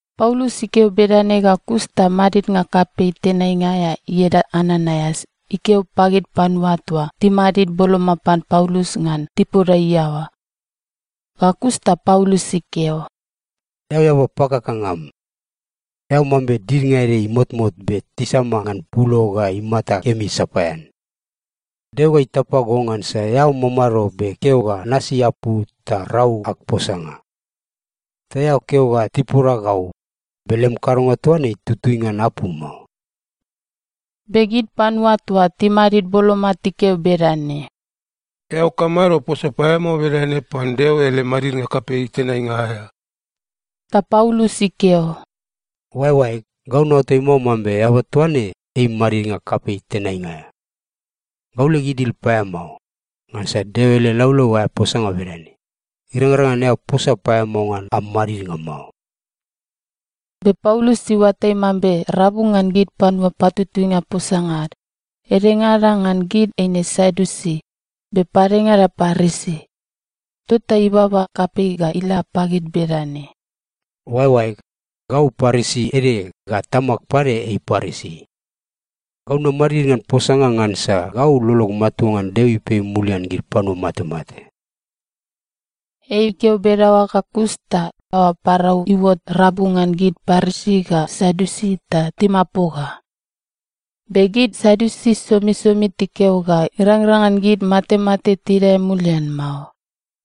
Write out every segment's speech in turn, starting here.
Paulus ikeo bedane ga kus ta madidnga kapei tenainga aea ieda Ananaias ikeo pagid panua toa timadid boloma pan Paulus ngan tipoda iaoa. Ga kus ta Paulus ikeo, “Eao eaba pakakanga am! Eao mambe didnga ede imotmot be tisama ngan pulo ga imata kemi sapaean. Deo ga itapa go ngansa eao mamado be keo ga nasi apu ta rau ag posanga. Ta eao keo ga tipoda gau, be lem kadonga toa ne itutui ngan apu mao!” Be gid panua toa timadid boloma tikeo bedane, “Eao kamado posa paeamao bedane pan Deo ele madidnga kapei tenainga aea?” Ta Paulus ikeo, “Oaeoaeg, gau naoatai mao mambe eaba toa ne ei madidnga kapei tenainga aea. Gau leg idil paeamao, ngansa Deo ele laulau aea posanga bedane, ‘Irangrang ngan eao posa paeamao ngan am madidnga mao.’” Be Paulus iuatai mambe rabu ngan gid panua patutuinga posanga ad, edengada ngan gid eine Sadiusi, be padengada Parisi, tota ibaba kapei ga ila pagid bedane, “Oaeoaeg, gau Parisi ede ga tamag pade ei Parisi. Gau namadid ngan posanga ngansa gau lolog matua ngan Deo ipei mulian gid panua matemate.” Ei ikeo bedaoa ga kus ta aoa parau iuot rabu ngan gid Parisi ga Sadiusi ta timapoga. Be gid Sadiusi somisomi tikeo ga irangrang ngan gid matemate tidae mulian mao,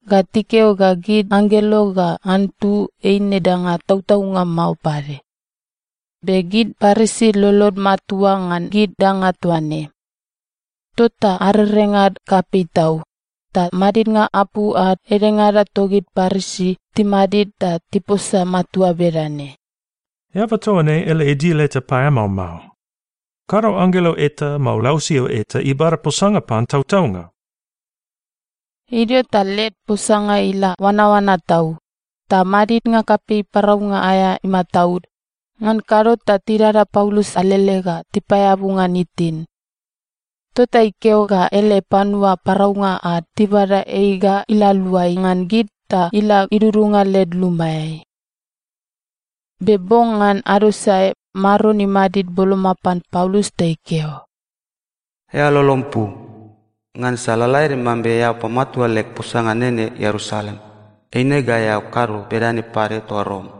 ga tikeo ga gid anggelo ga antu eine danga tautaunga mao pade. Be gid Parisi lolod matua ngan gid danga toa ne. Tota arerengad kapei tau, ta madidnga apu ad edengada togid Parisi timadid ta tiposa matua bedane, “Eaba toa ne ele idil eta paeamao mao. Kado anggelo eta, mao lausio eta ibada posanga pan tautaunga.” Idio ta led posanga ila oanaoana tau, ta madidnga kapei paraunga aea imataud, ngan kado ta tidada Paulus alele ga tipaeabu ngan itin. Tota ikeo ga ele panua paraunga ad tibada ei ga ila aluai ngan gid ta ila idudunga led lumaeai. Be bong ngan ado sae, Maron imadid boloma pan Paulus ta ikeo, “Eao lolom pu. Ngansa lalaede mambe eao pamatua leg posanga nene Ierusalem, eine ga eao kado bedane pade toa Rom.”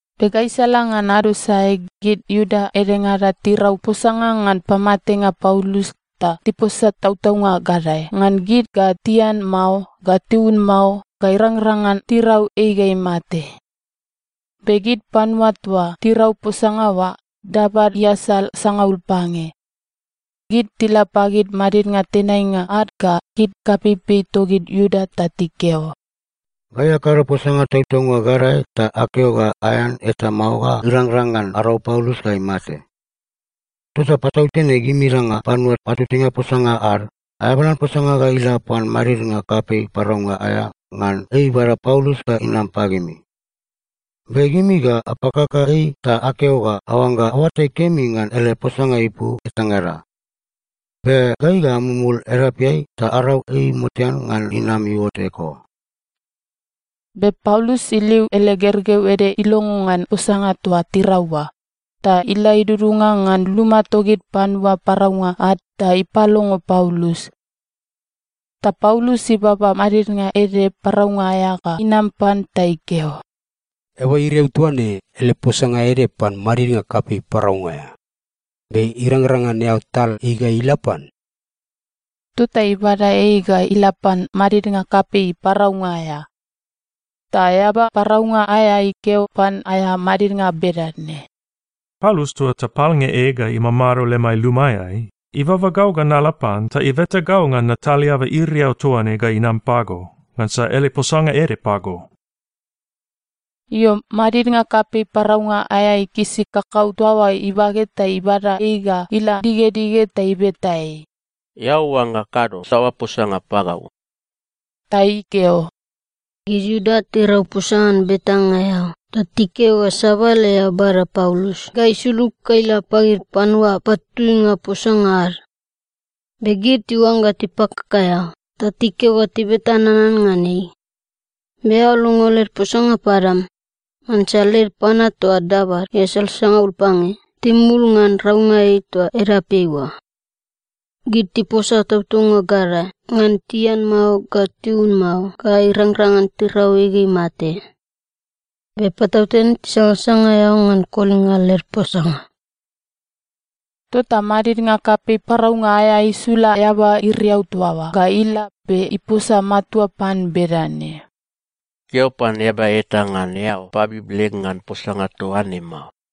Be gaisala ngan ado sae gid Iuda edengada tirau posanga ngan pamatenga Paulus ta tiposa tautaunga gadae, ngan gid ga tian mao ga tiun mao ga irangrang ngan tirau ei ga imate. Be gid panua toa tirau posanga oa, dabad iasal sangaul pange. Gid tila pagid madidnga tenainga ad ga gid kapeipei togid Iuda ta tikeo, “Gai akado posanga tautaunga gadae ta akeo ga aean eta mao ga irangrang ngan arau Paulus ga imate. Tota patautene gimingada panua patutuinga posanga ad aeabalan posanga ga ila pan madidnga kapei paraunga aea ngan ei ibada Paulus ga inam pagimi. Be gimi ga apakaka ei ta akeo ga aoangga aoatai kemi ngan ele posanga ipu etangada. Be gai ga amumul edapeai ta arau ei motean ngan inam iuot eko.” Be Paulus iliu ele gergeu ede ilongo ngan posanga toa tirau oa, ta ila idudunga ngan luma togid panua paraunga ad ta ipalongo Paulus. Ta Paulus ibaba madidnga ede paraunga aea ga inam pan ta ikeo, “Eaba iriau toa ne ele posanga ede pan madidnga kapei paraunga aea. Be irangrang ngan eao tal ei ga ila pan?” Tota ibada ei ga ila pan madidnga kapei paraunga aea. Ta eaba paraunga aea ikeo pan aea madidnga bedane, “Paulus toa tapalnge ei ga imamado lemai lumaeai, ibaba gau ga nala pan ta ibeta gau ngan natal eaba iriau toa ne ga inam pago, ngansa ele posanga ede pago.” Io, madidnga kapei paraunga aea ikisi kakau toa oa ibage ta ibada ei ga ila digedige ta ibeta ei, “Eao oangga kado saoa posanga pagau?” Ta ikeo, “Gid Iuda tirau posanga ngan betanga eao ta tikeo ga sabale eao bada Paulus ga isulug ga ila pagid panua patutuinga posanga ad. Be gid tiuangga tipakaka eao ta tikeo ga tibeta nanan ngan ei. Be eao longo led posanga padam. Ngansa led panua toa dabad iasal sangaul pange timumul ngan raunga ei toa edapeai oa. Gid tiposa tautaunga gadae ngan tian mao ga tiun mao ga irangrang ngan tirau ei ga imate. Be patautene tisangasanga eao ngan kolinga led posanga.” Tota madidnga kapei paraunga aea isula eaba iriau toa oa ga ila be iposa matua pan bedane, “Keo pan eaba eta ngan eao pabib leg ngan posanga toa ne mao.”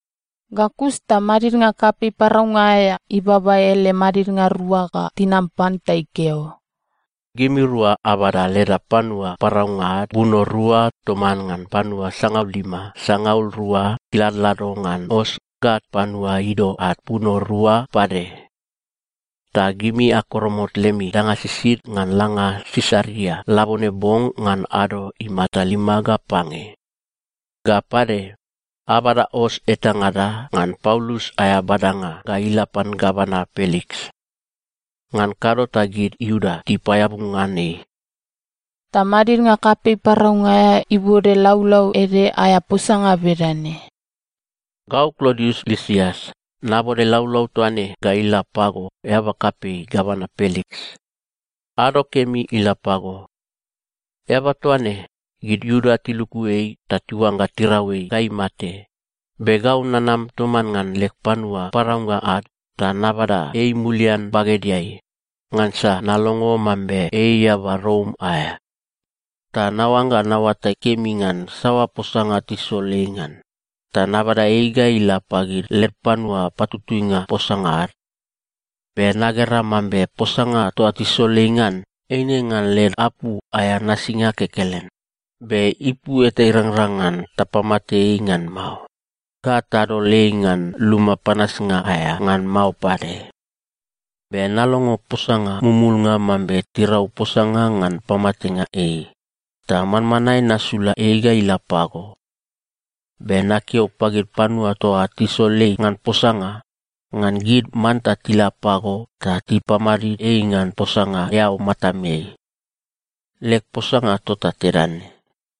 Ga kus ta madidnga kapei paraunga aea ibaba ele madidnga rua ga tinam pan ta ikeo, “Gimirua abada leda panua paraunga ad buno rua toman ngan panua sangalima sangaul rua tiladlado ngan os ga panua ido ad buno rua pade. Ta gimi akoromot lemi danga sisid ngan langa Sisaria labone bong ngan ado imata lima ga pange. Ga pade, abada os etangada ngan Paulus aea badanga ga ila pan gavana Peliks. Ngan kado ta gid Iuda tipaeabu ngan ei.” Ta madidnga kapei paraunga aea ibode laulau ede aea posanga bedane: Gau Klodius Lisias nabode laulau toa ne ga ila pago eaba kapei gavana Peliks. Ado kemi ila pago. Eaba toa ne, gid Iuda tiluku ei ta tiuangga tirau ei ga imate, be gau nanam toman ngan leg panua paraunga ad ta nabada ei mulian bagedeai, ngansa nalongo mambe ei eaba Rom aea. Ta naoangga naoatai kemi ngan saoa posanga tisol ei ngan, ta nabada ei ga ila pagid led panua patutuinga posanga ad. Be nagera mambe posanga toa tisol ei ngan eine ngan led apu aea nasinga kekelen, be ipu eta irangrang ngan tapamate ei ngan mao, ga tadol ei ngan luma panasnga aea ngan mao pade. Be nalongo posanga mumulnga mambe tirau posanga ngan pamatenga ei, ta manmanae nasula ei ga ila pago. Be nakeo pagid panua toa tisol ei ngan posanga, ngan gid manta tila pago ta tipamadid ei ngan posanga eao matameai. Leg posanga tota tedane.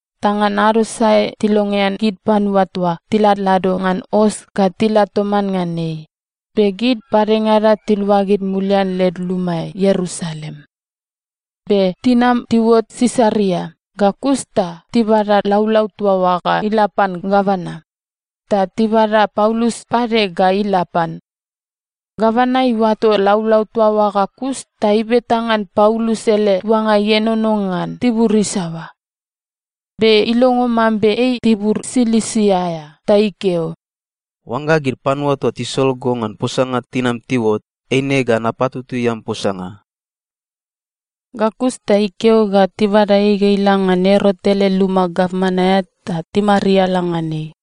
Ta ngan ado sae tilongean gid panua toa tiladlado ngan os ga tila toman ngan ei, be gid padengada tiluagid mulian led lumaeai Ierusalem. Be tinam tiuot Sisaria ga kus ta tibada laulau toa oa ga ila pan gavana, ta tibada Paulus pade ga ila pan. Gavana iuato laulau toa oa ga kus ta ibeta ngan Paulus ele tuanga ienono ngan tibur isaoa. Be ilongo mambe ei tibur Silisia aea ta ikeo, “Oangga gid panua toa tisol go ngan posanga tinam tiuot, eine ga napatutui am posanga.” Ga kus ta ikeo ga tibada ei ga ila ngan Erot ele luma gavman aea ta timariala ngan ei.